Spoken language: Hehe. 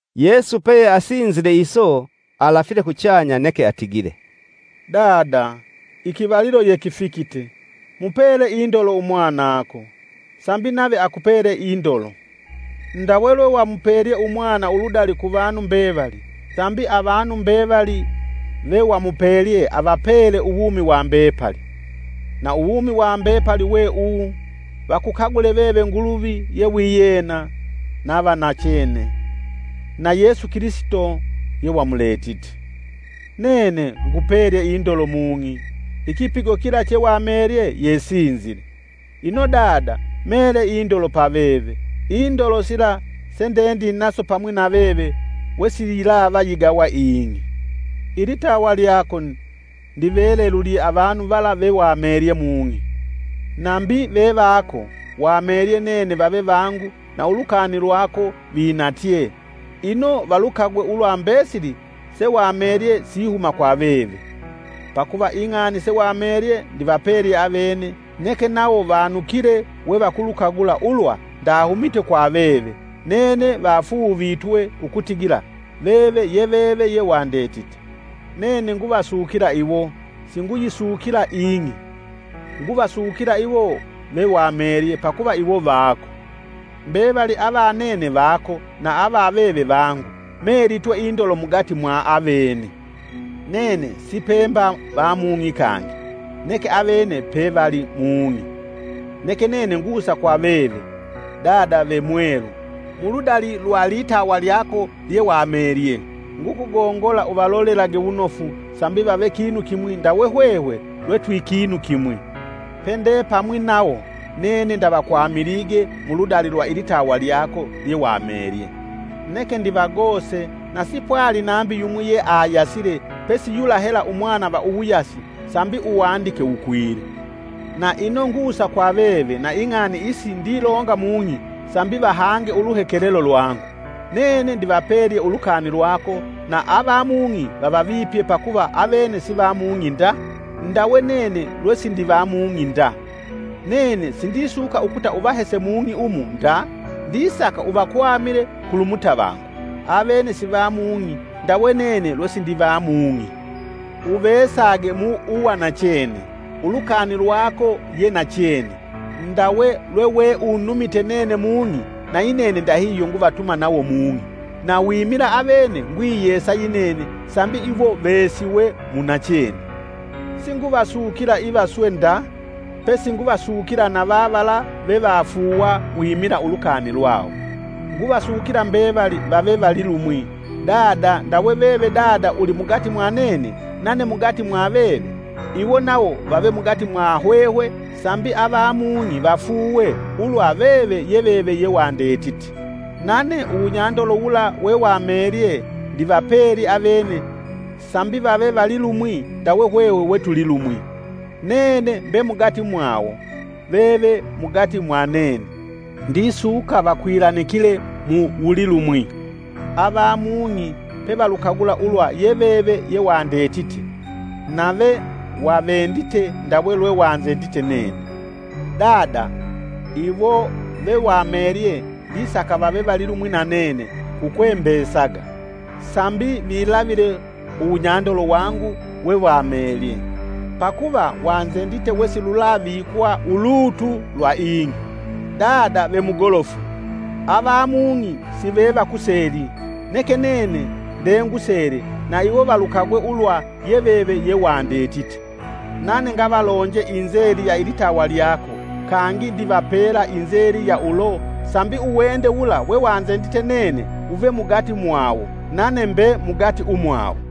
Yesu peyeasinzile iso, alafile kuchanya neke atigile, “Dada ikivalilo yekifikite! Mupele indolo Umwanako, sambi nave akupele indolo. Ndawe lwewamupelye umwana uludali kuvanu mbevali, sambi avanu mbevali vewamupelye apele uwumi wa mbepali. Na uwumi wa mbepali we uwu vakukagule veve Nguluvi ye wiyena na va nachene, na Yesu Kilisito yewamuletite. Nene ngupelye indolo mung'i; ikipigo kila chewamelye yesinzile. Ino Dada mele indolo pa veve, indolo sila sendendinaso pamwi na veve wesiyilava yigawa ing'i.” Ilitawa lyako ndivelelulye avanu vala vewamelye mung'i, nambi vevako, wamelye nene vave vangu na ulukani lwako vinatyee. Ino valukagwe ulwa mbesili sewamelye sihuma kwa veve. Pakuva ing'ani sewamelye ndivapelye avene neke nawo vanukile we vakulukagula ulwa ndahumite kwa veve, nene vafuuvitwe ukutigila veve ye veve yewandetite. “Nene nguvasukila iwo; singuyisukila ing'i nguvasukila iwo vewamelye pakuva iwo vako. Mbevali ava nene vako na ava veve vangu; melitwe indolo mugati mwa avene. Nene sipemba va mung'i kangi, neke avene pevali mung'i. neke nene ngusa kwa veve. Dada ve Mwelu! Muludali lwa litawa lyako lyewamelye, ngukugongola uvalolelage wunofu sambi vave kinu kimwi ndawe hwehwe lwe twikinu kimwi. Pendepamwi nawo, nene ndavakwamilige mu ludali lwa ilitawa lyako lyewamelye, neke ndivagose na sipwali nambi yumwi yeayasile pesi yula hela umwana va uwuyasi sambi uwandike wukwile. Na ino ngusa kwa veve na ing'ani isi ndilonga mung'i sambi vahange uluhekelelo lwangu. Nene ndivapelye ulukani lwako na ava mung'i vavavipye pakuva avene sivamung'i nda, ndawe nene lwesindiva mung'i nda. Nene sindisuka ukuta uvahese mung'i umu nda, ndisaka uvakwamile kulu mutavangu. Avene sivamung'i ndawe nene lwesindiva mung'i. Uveesage mu uwanachene; ulukani lwako ye nachene. Ndawe lweweunumite nene mung'i na yinene ndahihyo nguvatuma nawo mung'i. Na wimila avene ngwiyesa yinene sambi iwo veesiwe mu nachene. “Singuvasukila iva swe nda, pesi nguvasukila na vavala vevafuuwa wimila ulukani lwawo. Nguvasukila mbevali vave vali lumwi. Dada! Ndawe veve Dada uli mugati mwa nene, nane mugati mwa veve. Iwo nawo vave mugati mwa hwehwe sambi avamung'i vafuuwe ulwa veve ye veve yewandetite. Nane uwunyandolo wula wewamelye ndivapelye avene sambi vave vali lumwi ndawe hwehwe we tuli lumwi. Nene mbe mugati mwawo, veve mugati mwa nene; Ndisuka vakwilanikile ukuvavalilumwi, ava mung'i pevalukagula ulwa ye veve yewandetite nave wavendite ndawe lwewanzendite nene. “Dada! Iwo vewamelye ndisaka vave valilumwi na nene kukwembesaga, sambi vilavile uwunyandolo wangu wewamelye, pakuva wanzendite wesilulavikwa ulutu lwa ing'i. Dada ve Mugolofu! Avamung'i sivevakuseli, neke nene ndengusele na iwo valukagwe ulwa ye veve yewandetite. Nane ngavalonje inzeli ya ilitawa lyako kangi ndivapela inzeli ya ulo sambi uwende wula wewanzendite nene wuve mugati mwawo nane mbe mugati umwawo.”